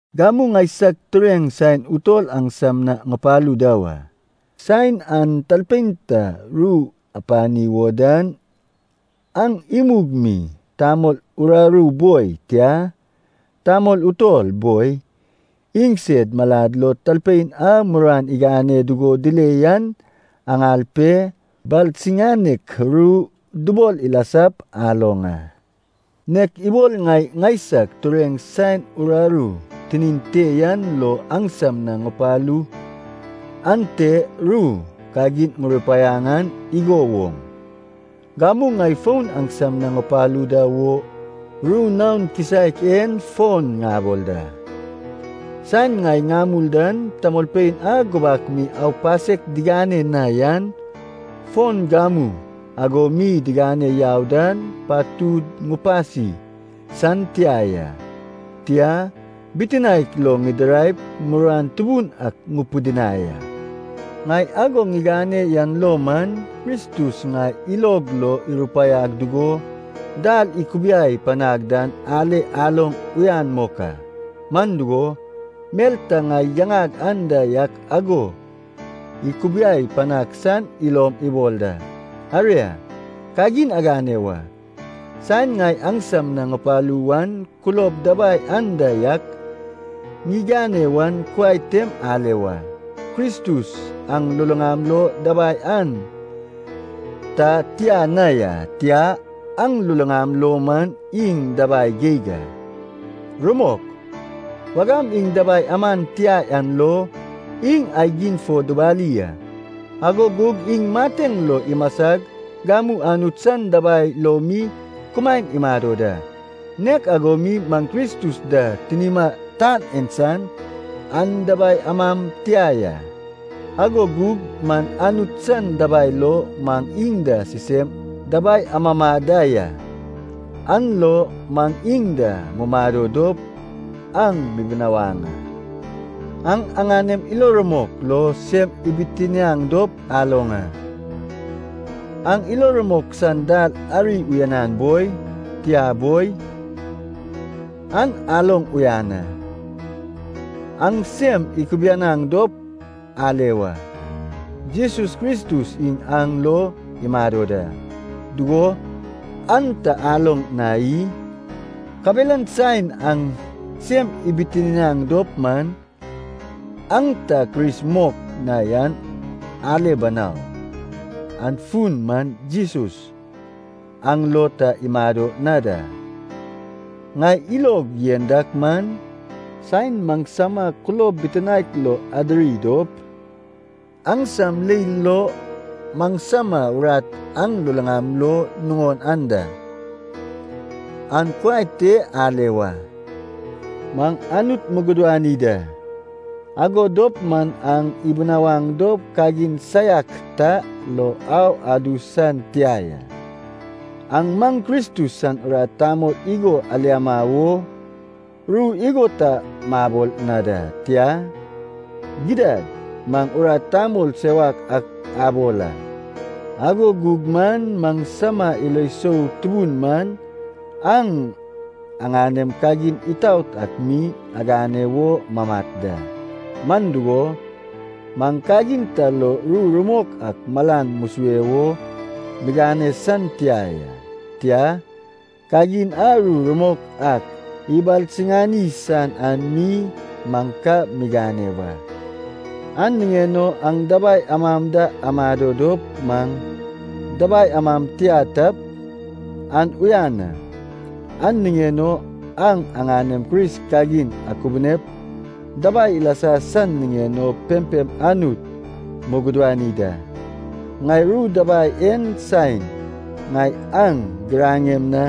Gamu ŋaisag tureŋ saen utol aŋsam na ŋupalu da wa. Saen aŋ talpein ta ru apani wo dan, aŋ imug mi tamol uraru boi, tia, tamol utol boi, iŋsed malad lo talpein a muruan igane dugo dile yan aŋal pe, balsiŋanek ru dubol ilasap aloŋ a. Nek ibol ŋai ŋaisag tureŋ saen uraru tinin te yan lo aŋsam na ŋupalu ante ru kagin ŋurupaiaŋ an igo woŋ, gamu ŋai fon aŋsam na ŋupalu da wo ru naon kisaek en fon ŋabol da. Saen ŋai ŋamul dan, tamolpein a gubak mi aupasek digane na yan, fon gamu ago mi digane yau dan, patud ŋupasi san tia ya. Tia, bitinaek lo ŋidiraip muruan tubun ak ŋupidinai a. Ŋai ago ŋigane yan lo man, Kristus ŋai ilog lo irupaiag dugo dal ikubiai panag dan ale aloŋ uyan mok a, man dugo, mel ta ŋai yaŋag anda yak ago ikubiai panaŋ san ilom ibol da. Aria, kagin agane wa, saen ŋai aŋsam na ŋupalu wan kulob dabai anda yak ŋigane wan kuai tem ale wa. Kristus aŋ luluŋam lo dabai an ta tia na ya. Tia. Aŋ luluŋam lo man iŋ dabai geig a. Rumok, wagam iŋ dabai aman tia an lo iŋ aigim fo dubali a, ago gug iŋ mateŋ lo imasag gamu Anut san dabai lo mi kumaen imado da. Nek ago mi maŋ Kristus da tinima tan en san an dabai amam tia ya, ago gug man Anut san dabai lo maŋ iŋ da sisem dabai amama da ya, an lo maŋ iŋ da mumado dop aŋ mibinawaŋ a. Aŋ aŋanem ilo rumok lo sem ibitiniaŋ dop aloŋ a, aŋ ilo rumok san dal ari uyanan boi, tia boi, an aloŋ uyan a. Aŋ sem ikubianaŋ dop ale wa. Jesus Kristus iŋ aŋ lo imado da, dugo, an ta aloŋ na i? Kabelan saen aŋ sem ibitiniaŋ dop man, aŋ ta Kris mok na yan ale banau. An fun man Jesus aŋ lo ta imado na da! Ŋai ilog yen dak man, saen maŋsama kulob bitinaek lo adiri dop, aŋsam leil lo maŋsama urat aŋ luluŋam lo nuŋon anda, an kuai te ale wa. Maŋ Anut mugudani da, ago dop man aŋ ibinawaŋ dop kagin saiak ta lo au adu san tia ya. Aŋ maŋ Kristus san urat tamol igo aliama wo ru igo ta mabol na da. Tia. Gidad maŋ urat tamol sewak ak abol a, ago gug man maŋsama ilo sou tubun man aŋ aŋanem kagin itaot ak mi agane wo mamat da. Man dugo, maŋ kagin ta lo ru rumok ak malan musue wo migane san tia ya. Tia, kagin a ru rumok ak ibalsiŋani san an mi maŋ ka migane wa. An niŋen o aŋ dabai amam da amado dop maŋ dabai amam tia tap, an uyan a. An niŋen o aŋ aŋanem Kris kagin akubunep dabai ilasa san niŋen o pempem Anut mugudani da. Ŋai ru dabai en saen ŋai aŋ giraŋem na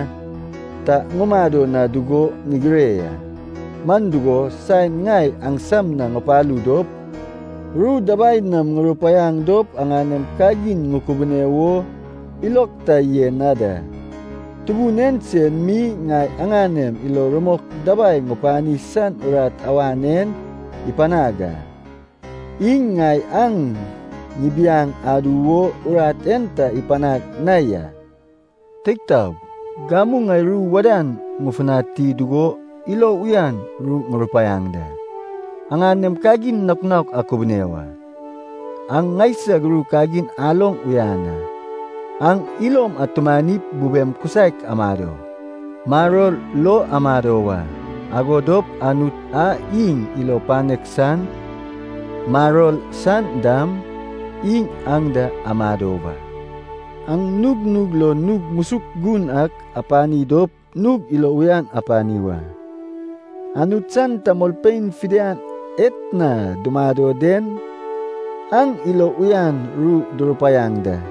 ta ŋumado na dugo ŋigire ya. Man dugo, saen ŋai aŋsam na ŋupalu dop, ru dabai nam ŋurupaiaŋ dop aŋanem kagin ŋukubune wo ilog ta yen na da. Tubun en sen mi ŋai aŋanem ilo rumok dabai ŋupani san urat awan en ipanag a, iŋ ŋai aŋ ŋibiaŋ adu wo urat en ta ipanag na ya. Teig taog, gamu ŋai ru wadan ŋufutani dugo ilo uyan ru ŋurupaiaŋ da. Aŋanem kagin naok naok akubune wa. Aŋ ŋaisag ru kagin aloŋ uyan a. Aŋ ilom atumanip bubem kisaek amado, maror lo amado wa. Ago dop Anut a iŋ ilo panek san, maror san dam, iŋ aŋ da amado wa. Aŋ nugnug lo nug musuk gun ak apani dop nug ilo uyan apani wa. Anut san tamolpein fidian etna dumado den aŋ ilo uyan ru durupaiaŋ da.